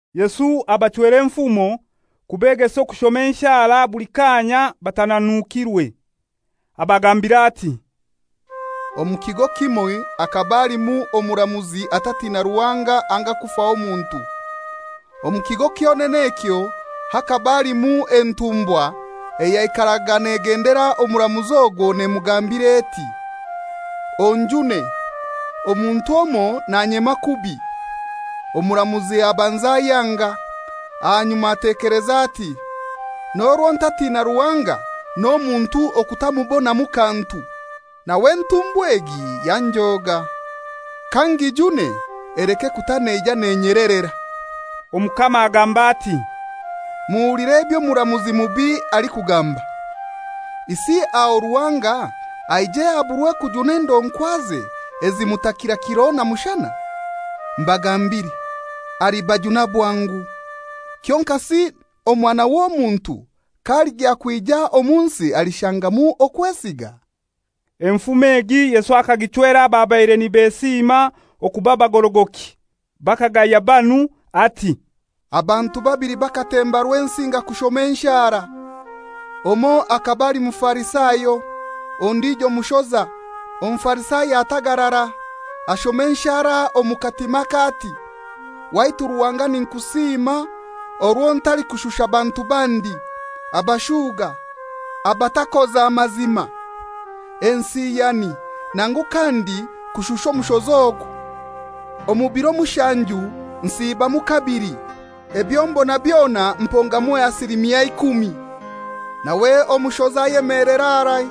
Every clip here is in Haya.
Yesu abachwera enfumo, kubegesa okushoma enshara buli kaanya batananukirwe. Abagambira ati, «Omu kigo kimoi hakaba halimu omuramuzi atatina Ruhanga anga kufaho muntu. Omu kigo kyonene ekyo hakaba halimu entumbwa eyaikaraga nagendera omuramuzi ogwo nemugambira eti, ‹Onjune, omuntu omoi nanyema kubi.› Omuramuzi abanza ayanga. Ahanyuma atekeleza ati, ‹N'orwo ntatiina Ruhanga n'omuntu okutamubonamu kantu, nawe entumbwakazi egi yanjoga. Kangijune, eleke kuta neija nenyelerera.›» Omukama agamba ati, «Muhulire eby'omuramuzi mubi alikugamba. Isi aho Ruhanga aije aburwe kujuna endonkwaze ezimutakira kiro na mushana? Mbagambire, alibajuna bwangu. Kyonkasi Omwana w'Omuntu k'aligya kwija omu nsi alishangamu okwesiga?» Omugani ogu Yesu akaguchwera ababaire nibesiima okuba bagorogoki, bakagaya banu; ati, «Abantu babili bakatemba Rwensinga kushoma enshara. Omoi akaba ali Mufarisayo, ondijo mushoza. Omufarisayo atagarara, ashoma enshara omu katimake ati, ‹Waitu Ruhanga ninkusiima orwo ntalikushusha bantu bandi, abashuga, abatakoza mazima, ensiyani, nangu kandi kushusha omushoza ogu! Omu biro mushanju nsiibamu kabili; ebyo mbona byona mpongamu ekichweka kya ikumi.› Nawe omushoza ayemelera harai,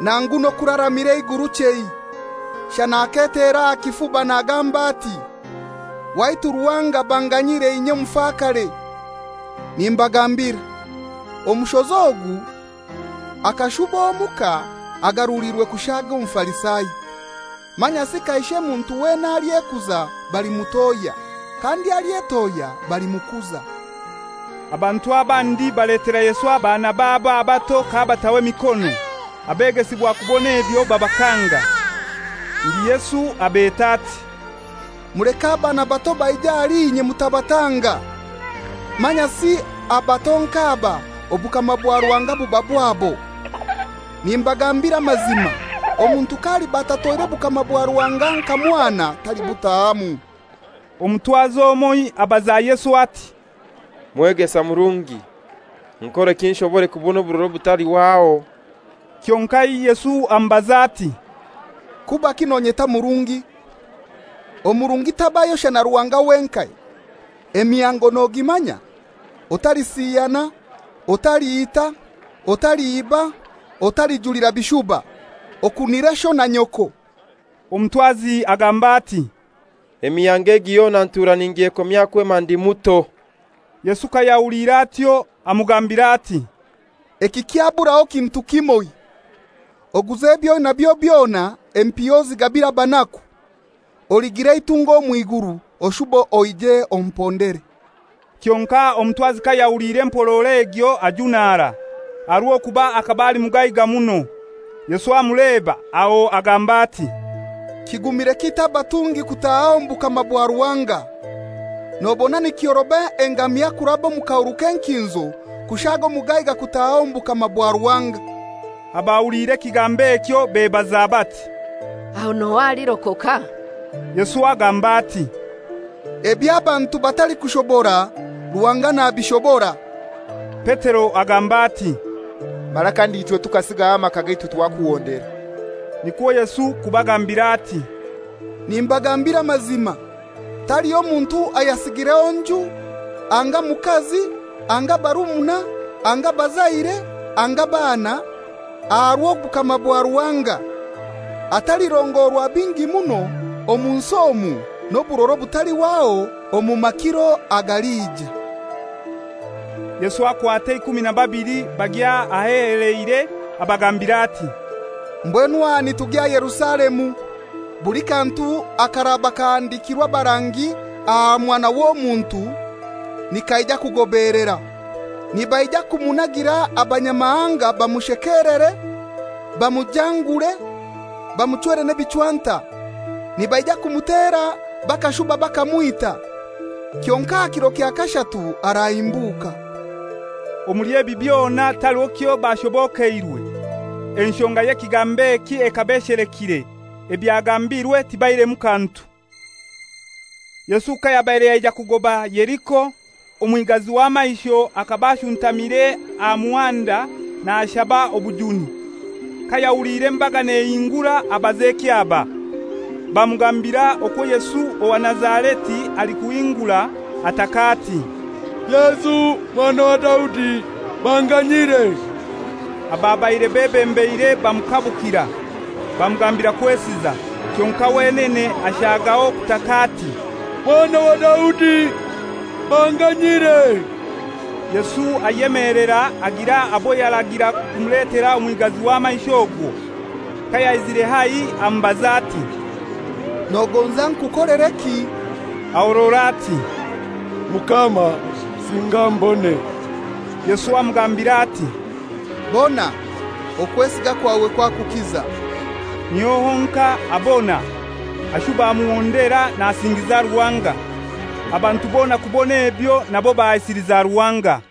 nangu n'okuraramira eiguru chei. Shana aketera aha kifuba nagamba ati, ‹Waitu Ruhanga banganyire inye omufakare!› Nimbagambira, omushoza ogu akashuba omuka agaruliirwe kushaaga Omufarisayo. Manyasi kaishe muntu weena alyekuza balimutohya, kandi alyetohya balimukuza.» Abantu abandi baletera Yesu abaana babo abato k'abataho emikono. Abegesibwa kubon'ebyo babakanga. Ndi Yesu abeta ati, «Muleke abaana bato baije ahali inye mutabatanga, manyasi abato nk'aba obukama bwa Ruhanga buba bwabo. Nimbagambira amazima, omuntu k'aliba atatoire bukama bwa Ruhanga nka mwana talibutahamu.» Omutwazi omoi abaza Yesu ati, «Mwegesa murungi, nkoreki nshobore kubona oburora obutalihwaho?» Kyonkai Yesu amubaza ati, «Kubaki nonyeta murungi? Omurungi tabayo shana Ruhanga wenkai. Emihango nogimanya: ‹Otalisiyana, otaliita, otaliiba, otalijulira bishuba, okunire sho na nyoko.›» Omutwazi agamba ati, «Emihango egi yona ntura ningyekomya kwema ndi muto.» Yesu kayahuliire atyo, amugambira ati, «Ekikyaburaho kintu kimoi: Oguze eby'oinabyo byona, empiha ozigabire abanaku, oligira eitunga omw'iguru, oshube oije ompondere.» Kyonkai omutwazi kayahuliire empororo egyo ajunara, aha rw'okuba akaba ali mugaiga muno. Yesu amuleba, aho agamba ati, «Kigumire kitai abatungi kutaaha omu bukama bwa Ruhanga! Nobona nikyoroba engamia kuraba omu kahuru k'enkinzo kushaaga omugaiga kutaaha omu bukama bwa Ruhanga.» Abahuliire ekigambo ekyo bebaza bati, «Aho n'ohai alirokoka?» Yesu agamba ati, «Ebyo abantu batalikushobora, Ruhanga nabishobora.» Petero agamba ati, «Mara kandi ichwe tukasigaho amaka gaitu twakuhondera.» Nikwo Yesu kubagambira ati, «Nimbagambira amazima, taliho muntu ayasigireho nju anga mukazi anga barumuna anga bazaire anga baana, aha rw'obukama bwa Ruhanga, atalirongorwa bingi muno omu nsi omu n'oburora obutalihwaho omu makiro agalija.» Yesu akwata eikumi na babili bagya aheheleire, abagambira ati, «Mbwenu aha nitugya Yerusalemu. Buli kantu akaraba kahandikirwe abarangi aha Mwana w'Omuntu nikaija kugobeelera. Nibaija kumunagira abanyamahanga bamushekelere, bamujangure, bamuchwere n'ebichwanta. Nibaija kumutera bakashuba bakamwita. Kyonkai aha kiro kya kashatu arahimbuka.» Omuli ebi byona taliho kyo bashobokeirwe. Enshonga y'ekigambo eki ekaba eshelekire, ebyagambirwe tibaihiremu kantu. Yesu kayabaire yaija kugoba Yeriko, omwigazi w'amaisho akaba ashuntamire aha muhanda nashaba obujuni. Kayahuliire embaga nehingura abaza ekyaba. Bamugambira okwo Yesu owa Nazareti alikuhingura. Ataka ati, «Yesu Mwana wa Daudi, banganyire!» Ababaire bebembeire bamukabukira, bamugambira kwesiza. Kyonkai wenene ashagaho kutaka ati, «Mwana wa Daudi, banganyire!» Yesu ayemelera, agira abo yaragira kumuletera omwigazi w'amaisho ogwo. Kayaizire haihi amubaza ati, «Nogonza nkukolereki?» Ahorora ati, «Mukama, singa mbone.» Yesu amugambira ati, «Bona; okwesiga kwawe kwakukiza.» Niho honkai abona, ashuba amuhondera nasingiza Ruhanga. Abantu bona kubon'ebyo nabo bahaisiliza Ruhanga.